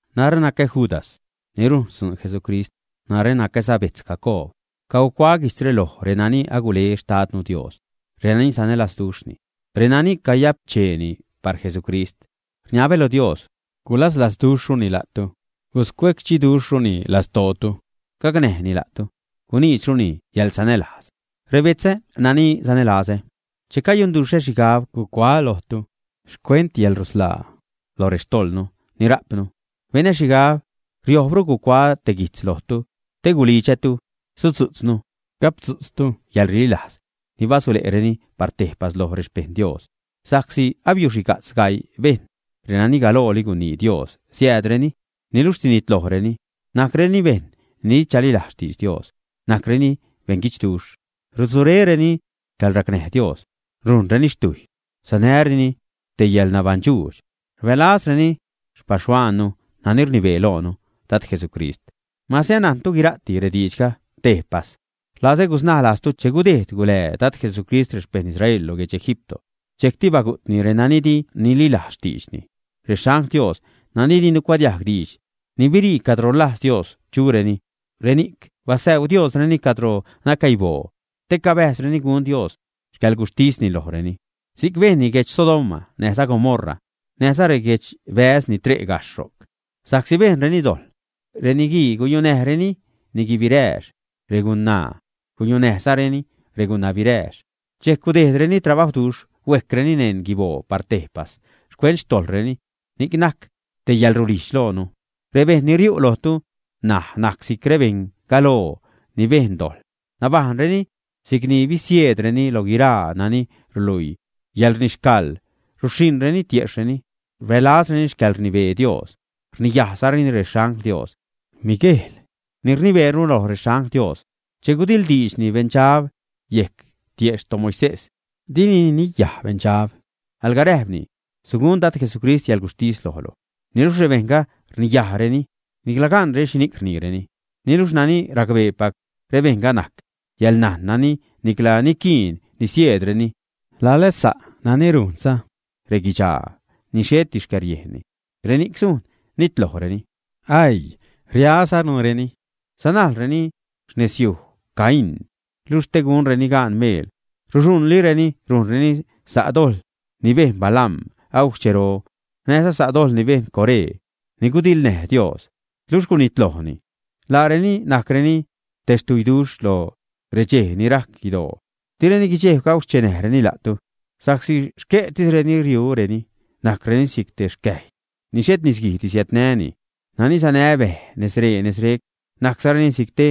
Narä nacä Judas, ni rujn xtzuun Jesucrist. Narä nacäza betz Jacoob. Cagucuaä guijtzre loj renani agule xtadnu Dios, renani sanälazduxhni, nani cayapcheeni par Jesucrist. Rniabä lo Dios, gulaslazduxhruni la'tu, guscuecdxiduxhruni lastootu, gacnäjni la'tu, guniidxruni yäḻsanälajz. Rebetzä nani sanälazä, che cayunduxhä xhigab gucuaä lojtu xcuent yäḻrusḻaa lo rextojḻnu ni rajpnu, benä xhigab riojbru gucuaä te guijtz lojtu te gulidxätu sudzu'tznu, gapdzu'tztu yäḻrililajz ni basule'reni par tejpas loj rexpejṉ Dios. Sa'csi abiuxhiga'tz gaii bejṉ, renani galooli gunii Dios siäädreni, niluxh sinitlojreni. Najcreni bejṉ ni di chalilajz xtidx Dios, najcreni beṉguidxduxh, rutzuréreni xcäḻracnäj Dios, rujnreni xtujy, sanäreni te yäḻnabaṉdxuudx. Rbälazzareni xpaxhuaannu nani rnibee loonu, Dad Jesucrist. Mase anajntu guira'ti rediidxga tejpas, rlazä gusnaä lajztu che gudejd gulää Dad Jesucrist rexpejṉ Israel lo guedx Egipto, dxejcti bagu'tni renani di nililajz xtiidxni. Rexangl Dios nani di nucuadiajg diidx, ni birii cadro rlajz Dios chureni, reni'c basäu Diosreni cadro nacäiboo te cabäjzreni gun Dios xcäḻguxhtisni lojreni. Si'c bejnni guedx Sodoma näjza Gomorra näjza reguedxbäz ni tre' gajxh ro'c, sa'csi bejnreni dojḻ, reniguii guyunäjreni niguii birääx, regunaa guyunäjzareni regunabirääx. Dxejc gudejdreni trabawduxh huejcreni neṉ guiboo par tejpas xcuent xtojḻreni, ni'c najc te yälrulijdx loonu. Rebejṉ ni riu' lojtu ṉaj najc si'c rebeṉ galoo ni bejn dojḻ. Nabajṉreni si'c ni bisieedreni lo guiraa nani ruluii yäḻrnixcaḻ, ruxhiṉreni tiejxhreni, rbälazreni xcäḻrnibee Dios, rniyajzareni rexangl Dios. Miguejl ni rnibeeru loj rexangl Dios, che gudiḻdiidxni beṉdxab yejc tiejxh toMoisés, dini niniyaj beṉdxab, alga räjpni: “Sugun Dad Jesucrist yäḻguxhtis lojlu.” Niluxh rebejṉga rniyajreni nicla ganreni xhini'c rniireni. Niluxh nani racbeepac rebejṉga najc yäḻnajn nani nicla niquiin nisieedreni, lala sa' nani rujnza reguidxaa, ni xheti xcäriejnni, reni'c sujn nitlojreni. ¡Aii! ¡Riazanureni! Sanajlreni xnezyuj Caín, luxh te gunreni gaan meel ruxhuṉlireni rujnreni sa' dojḻ ni bejn Balaam agujc xchero, näjza sa' dojḻ ni bejn Coré, ni gudiḻnäj Dios, luxh gunitlojni. Laareni najcreni te xtuiduxh lo rexchej ni rajc guidoo, direni guidxejb gauxchenäjreni la'tu, sa'csi xque'tisreni riureni. Najcreni si'c te xcäjy ni xhet nisguij siädnäni, nani sanä bej nezree nezrec; najczareni si'c te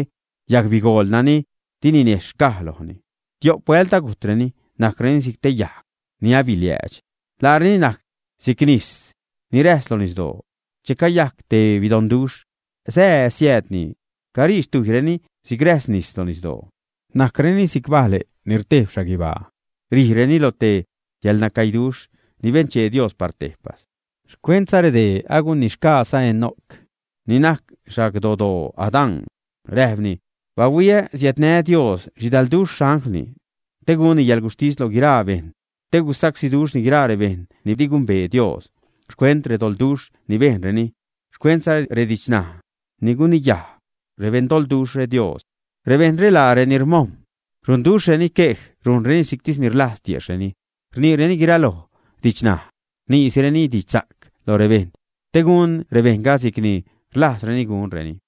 yagbigool nani di ninejxh xcaj lojni, tio'p huält agujtreni, najcreni si'c te yajg ni abiliäädx. Laareni najc si'c nis ni räjs lo nisdoo, che cayajc te bidoṉduxh, sää, siäädni, carii xtujyreni si'c räjs nis lo nisdoo. Najcreni si'c bale' ni rtejb xhaguibaa, rijreni lo te yäḻnacäiduxh ni benchee Dios par tejpas. Xcuentza redee agunixgaaza Enoc ni najc xagdodoo Adán, räjpni: “Bahuii, siädnä Dios xhidalduxh xanglni te gunni yäḻguxhtis loj guiraa bejṉ te gusacsíduxhni guiraa rebejṉ ni di gumbee Dios xcuent redoḻduxh ni bejnreni, xcuentza redidxnaj ni guniyaj rebeṉdoḻduxhre Dios.” Rebejṉre laa reni rmojm̲, runduxhreni quej, rujnreni si'ctis ni rlajz tiejxhreni, rniireni guiraloj didxnaj, rniisireni didxsa'c loj rebejṉ te gun rebejṉga si'c ni rlajzreni gunreni.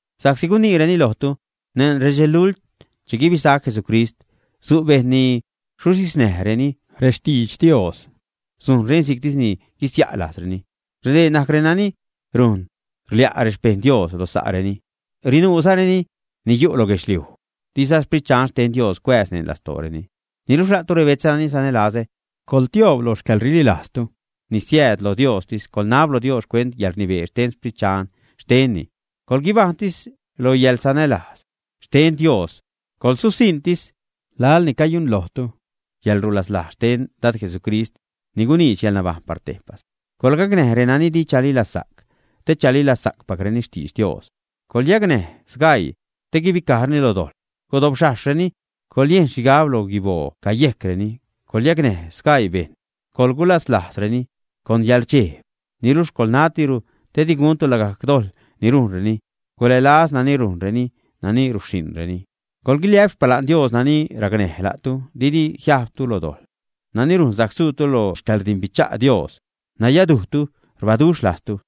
sa'csi guniireni lojtu: “Neṉ redxelult che guibisac Jesucrist, su' bejṉ ni suxhiznäjreni rextidx Dios, sujnreni si'ctis guisia' lajzreni.” Redee najc renani run rlia' rexpejṉ Dios lo sa'reni; rinuuzareni ni yu' lo guedxliuj, diza Xprit Dxan xten Dios cuääz neṉ lastooreni. Niluxh la'tu rebetzä nani sanälazä, coḻtioob loj xcäḻrililajztu ni siääd lo Diostis, coḻnab lo Dios xcuent yäḻrnibee xten Xprit Dxan xtenni. Coḻguibajṉtis lo yäḻsanälajz xten Dios, coḻsusiṉtis laḻ ni cayunlojtu yäḻrulaslajz xten Dad Jesucrist ni guniidx yäḻnabajṉ par tejpas. Coḻgacnäj renani di chalilazsa'c te chalilajzpacreni xtidx Dios. Coḻyacnäj sgaii te guibicajreni lo dojḻ, gudobxhajxreni, coḻyejn xhigab lo guiboo cayejcreni. Coḻyacnäj sgaii bejṉ, coḻgulaslajzreni con yäḻrdxejb, niluxh coḻnatiru te di guntu lagajc dojḻ ni rujnreni. Gulälaz nani rujnreni, nani ruxhiṉreni. Coḻguiliä'p xpala'n Dios nani racnäj la'tu didi jiajbtu lo dojḻ, nani rujn sajc suutu lo xcäḻrdimbicha' Dios, nayadujtu, rbaduxh lajztu.